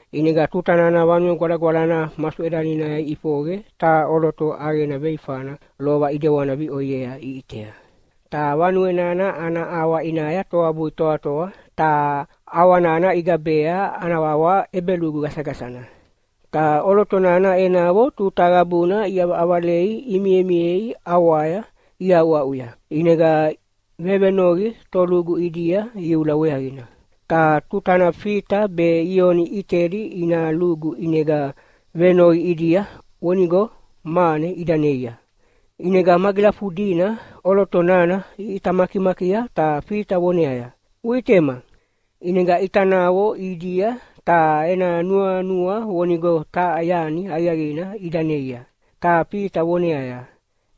ʼInega tuta nana Vanue Gwalagwalana masuʼedaninaya iʼifoqe taha ʼoloto ʼaqena veifana lova ʼidewana viʼoiea iʼitea. Ta vanue nana ana ʼawa ʼinaya toabui toatoa ta ʼawa nana igabea ana wawa “ʼEbelugu Gasagasana.” Ta ʼoloto nana enavo tuta qabuna iʼavaʼavalei imimiei ʼawaya iaʼuaʼuya. ʼInega vevenoqi tolugu ʼidia iula weaqina. Ta tutana Fita be Ioni ʼitedi ina lugu ʼinega venoqi ʼidia vonigo mane ida neia. ʼInega magilafudina ʼoloto nana iʼita makimakia ta Fita voneaya, “Uʼitema!” ʼInega ʼita naqo ʼidia ta ena nuanua vonigo taha yani aqiaqina ida neia. Ta Fita voneaya,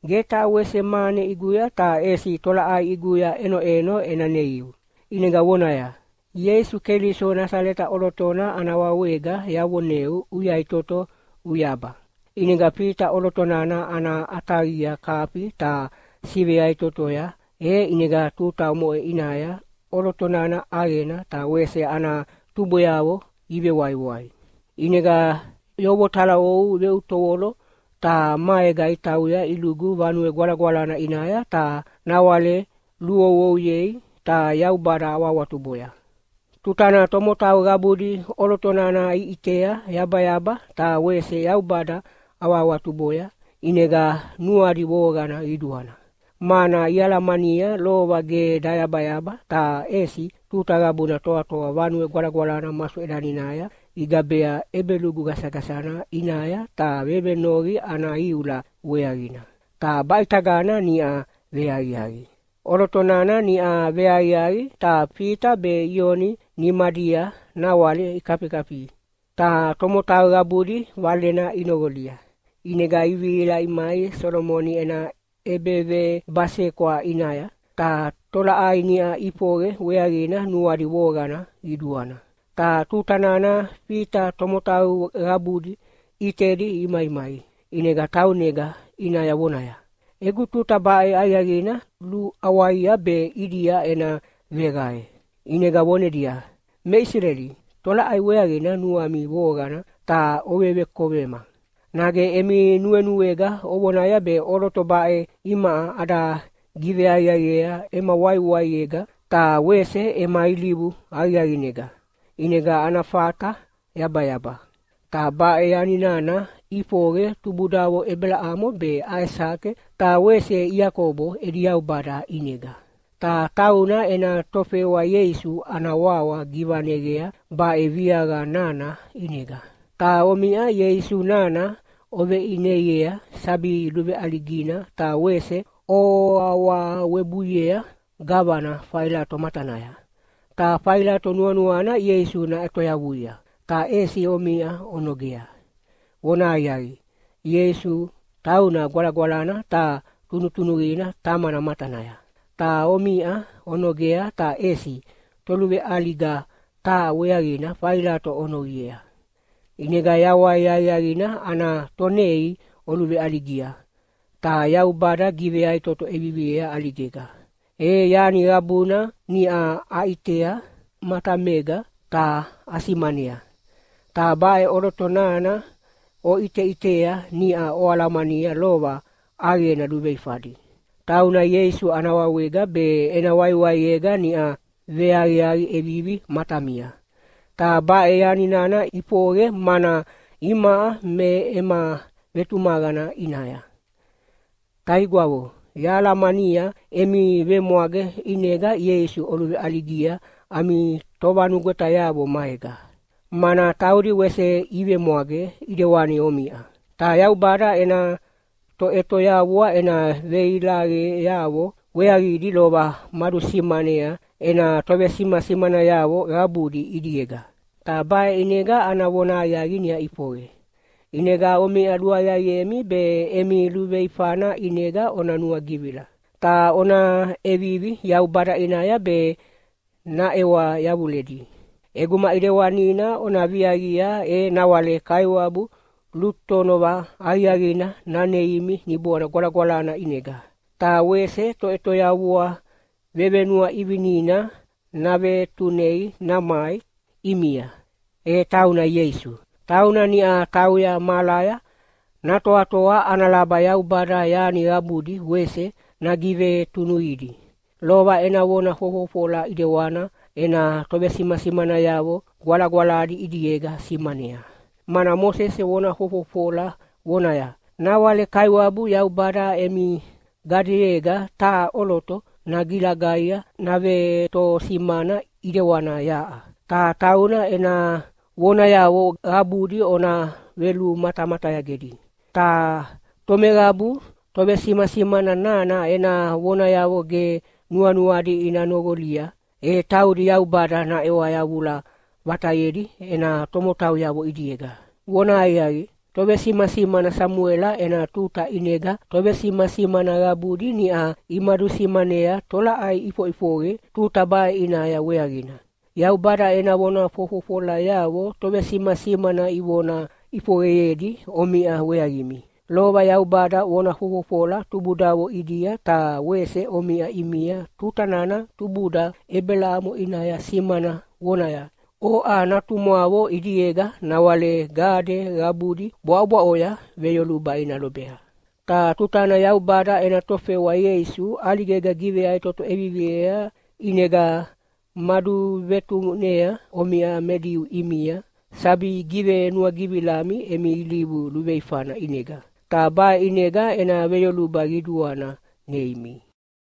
“Ge taha wese mane ʼiguya ta ʼesi tolaʼai ʼiguya ʼenoʼeno ena neiu.” ʼInega vonaya, “Ieisu Keliso Nasaleta ʼolotona ana wawega yavoneu uyaʼitoto uyaba!” ʼInega Fita ʼoloto nana ana ʼataqia kafia ta siveyaʼitotoya e ʼinega tuta omoʼe ʼinaya ʼoloto nana ʼaqena ta wese ana tubweavo ivewaiwai. ʼInega yovotalaou veutovolo ta maega itauya ilugu Vanue Gwalagwalana ʼinaya ta nawale luluououyei ta Yaubada awahawatuboya. Tutana tomotau qabudi ʼoloto nana iʼitea yabayaba ta wese Yaubada awahawatuboya, ʼinega nuadi voqana qiduana, mana ialamania lova ge dayabayaba ta ʼesi tuta qabuna toatoa Vanue Gwalagwalana masuʼedaninaya igabea “ʼEbelugu Gasagasana” ʼinaya ta vevenoqi ana iula weaqina. Ta baʼitagana niʼa veaqiaqi. ʼOloto nana niʼa veaqiaqi ta Fita be Ioni nimadia nawale kafikafi, ta tomotau qabudi valena inoqolia. ʼInega ivihila imai Solomoni ena ʼEbevebasekwa ʼinaya, ta tolaʼai niʼa ʼifoqe weaqina nuadi voqana qiduana. Ta tuta nana Fita tomotau qabudi ʼitedi imaimai, ʼinega taunega ʼinaya vonaya, “Egu tuta baʼe aqiaqina luʼawaia be ʼidia ena veqae.” ʼInega vonedia, “Me Isileli, tolaʼai weaqina nuami voqana ta ovevekovema? Nage emi nuenuega ovonaya be ʼoloto baʼe imaʼa ada giveaqiaqiea ema waiwaiega ta wese ema ilivu aqiaqinega, ʼinega ana fata yabayaba? Ta baʼe yani nana ʼifoqe tubudavo Ebelamo be Aisake ta wese Iakobo edi Yaubada ʼinega, ta tauna ena tofewa Ieisu ana wawa givaneqea baʼe viaqa nana ʼinega. Ta omiʼa Ieisu nana oveʼineiea sabi luveʼaligina ta wese oawawebuiea gavana Failato matanaya. Ta Failato nuanuana Ieisu naʼetoyavuia, ta ʼesi omiʼa onogea. Vonahaqiaqi, Ieisu tauna Gwalagwalana ta tunutunuqina Tamana matanaya, ta omiʼa onogea ta ʼesi toluveʼaliga taha weaqina Failato ovenoqiea. ʼInega yawai aqiaqina ana Tonei oluveʼaligia, ta Yaubada giveyaʼitoto ʼeviviea ʼaligega. E yani qabuna niʼa aʼitea matamega ta asimanea. Ta baʼe ʼoloto nana oʼiteʼitea niʼa oalamania lova ʼaqena luveifadi. Tauna Ieisu ana wawega be ena waiwaiega niʼa veaqiaqi ʼevivi matamia. Ta baʼe yani nana ʼifoqe mana imaʼa me ema vetumaqana ʼinaya. “Taigwavo, yahalamania emi vemwage ʼinega Ieisu oluveʼaligia ami tovanugwetayavo maega, mana taudi wese ivemwage ʼidewani omiʼa. Ta Yaubada ena Toʼetoyavua ena veilaqeavo weaqidi lova madusimanea ena tovesimasimanayavo qabudi ʼidiega. Ta baʼe ʼinega ana vonahaqiaqi niʼa ʼifoqe. ʼInega omiʼa luaqiaqiemi be emi luveifana ʼinega ona nuagivila, ta ona ʼevivi Yaubada ʼinaya be naʼewa yavuledi. ʼEguma ʼidewanina ona viaqia e nawale Kaiwabu lutonova aqiaqina naneimi Niboana Gwalagwalana ʼinega. Ta wese Toʼetoyavua vevenuaʼivinina navetunei namai ʼimia, e tauna Ieisu. Tauna niʼa tauya mahalaya natoatoa ana laba Yaubada yani qabudi wese nagivetunuqidi. Lova ena vona fofofola ʼidewana ena tovesimasimanayavo gwalagwaladi ʼidiega simanea, mana Mosese vona fofofola vonaya, ‘Nawale Kaiwabu Yaubada emi gadeyega taha ʼoloto nagilagaia navetosimana ʼidewana yaʼa. Ta tauna ena vonayavo qabudi ona velumatamatayagedi. Ta tomeqabu tovesimasimana nana ena vonayavo ge nuanuadi ina noqolia, e taudi Yaubada naʼewa yavula vatayedi ena tomotauyavo ʼidiega.’ “Vonahaqiaqi, tovesimasimana Samuela ena tuta ʼinega tovesimasimana qabudi niʼa imadusimanea tolaʼai ʼifoʼifoqe tuta baʼe ʼinaya weaqina. Yaubada ena vona fofofolayavo tovesimasimana ivona ʼifoqeyedi omiʼa weaqimi. Lova Yaubada vona fofofola tubudavo ʼidia ta wese omiʼa ʼimia tuta nana tubuda Ebelamo ʼinaya simana vonaya, ‘Oʼa natumwavo ʼidiega nawale gade qabudi bwaʼobwaʼoya veyoluba ina lobea.’ Ta tutana Yaubada ena tofewa Ieisu ʼaligega giveyaʼitoto ʼeviviea ʼinega maduvetunea omiʼa me Diu ʼimia sabi givenuagivilami emi ilivu luveifana ʼinega. Ta baʼe ʼinega ena veyoluba qiduana neimi.”